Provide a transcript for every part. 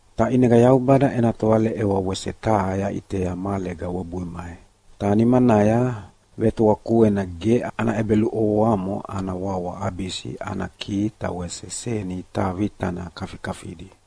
Ta ʼinega Yaubada ena tovaleʼewa wese taha yaʼitea mahalega webui mai. Ta nimanaya vetoa kuena ge ana ʼebeluʼovoamo ana wawa Abisi ana kihi ta wese seni taha vitana kafikafidi.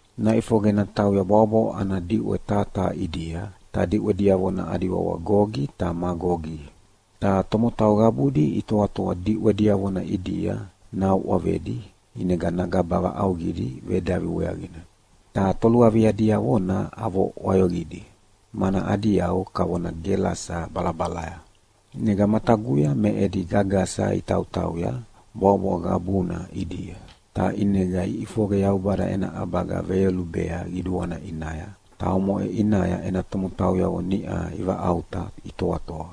Naʼifoqe natauya bwaʼobwaʼo ana diʼwe taha taha ʼidia, ta diʼwe diavona adi wawa Gogi ta Magogi. Ta tomotau qabudi itoatoa diʼwe diavona ʼidia nauʼavedi ʼinega nagaba vaʼauqidi vedavi weaqina. Ta toluavia diavona avo ʼwayoqidi, mana adi yau kavona gelasa balabalaya. ʼInega mataguya me edi gagasa itautauya bwaʼobwaʼo qabuna ʼidia, ta ʼinega iʼifoqe Yaubada ena ʼabaga veyolubea qiduana ʼinaya, ta omoʼe ʼinaya ena tomotauyavo niʼa ivaʼauta itoatoa,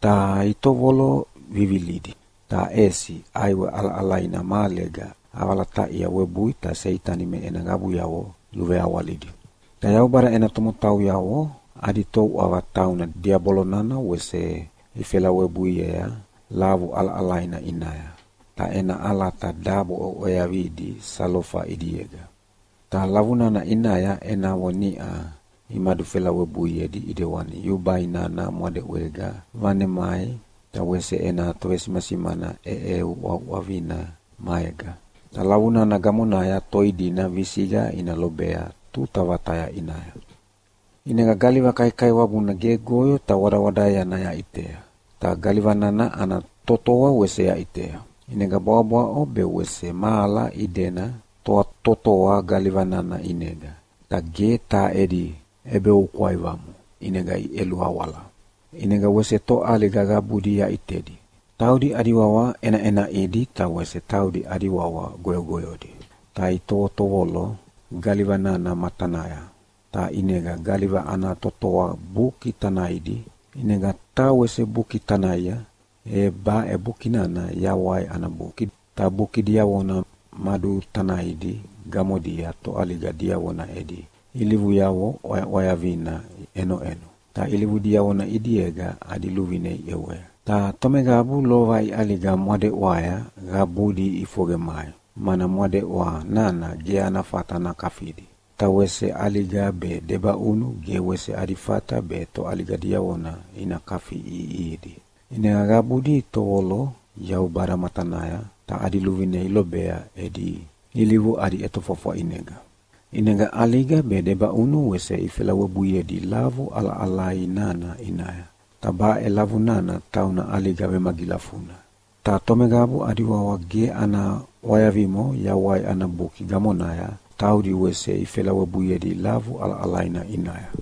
ta itovolo vivilidi. Ta ʼesi ʼaiwe ʼalaʼalaina mahalega ʼavalataʼia webui ta Seitani me ena qabuyavo luveawalidi. Ta Yaubada ena tomotauyavo adi touʼava tauna Diabolo nana wese ifelawebuiea lavu ʼalaʼalaina ʼinaya, ta ena ʼalata dabo ʼweaʼweavidi salofa ʼidiega. Ta lavu nana ʼinaya enavo niʼa imadufelawebuiedi ʼidewani yubai nana mwadeʼwega vanemai ta wese ena tovesimasimana ʼeʼeuʼauʼavina maega. Ta lavu nana gamonaya toi dina visiqa ina lobea tuta vataya ʼinaya. ʼInega galiva kaikaiwabuna gegoyo ta wadawadaeana yaʼitea, ta galiva nana ana totoa wese yaʼitea. ʼInega bwaʼobwaʼo be wese mahala idena totoa galiva nana ʼinega, ta ge taha edi ʼebeoukwaivamo, ʼinega iʼeluawala. ʼInega wese toʼaliga qabudi yaʼitedi, taudi adi wawa ʼenaʼenaʼidi ta wese taudi adi wawa goyogoyodi, ta itovotovolo galiva nana matanaya, ta ʼinega galiva ana totoa buki tanaidi. ʼInega taha wese buki tanaia, e baʼe buki nana Yawai ana Buki. Ta buki diavona madutanaidi gamodia toʼaliga diavona edi ilivuyavo ʼwayaʼwayavina ʼenoʼeno, ta ilivu diavona ʼidiega adi luvine iʼewea. Ta tomeqabu lova iʼaliga mwadeʼwaya qabudi iʼifoqe mai, mana mwadeʼwa nana ge ana fata nakafidi. Ta wese ʼaliga be debaʼunu ge wese adi fata be toʼaliga diavona ina kafiʼiʼihidi. ʼInega qabudi itovolo Yaubada matanaya ta adi luvine ilobea edi ilivu adi ʼetofwafwa ʼinega. ʼInega ʼaliga be debaʼunu wese ifelawebuiedi lavu ʼalaʼalai nana ʼinaya. Ta baʼe lavu nana tauna ʼaliga vemagilafuna. Ta tomeqabu adi wawa ge ana ʼwayavimo Yawai ana Buki gamonaya taudi wese ifelawebuiedi lavu ʼalaʼalaina ʼinaya.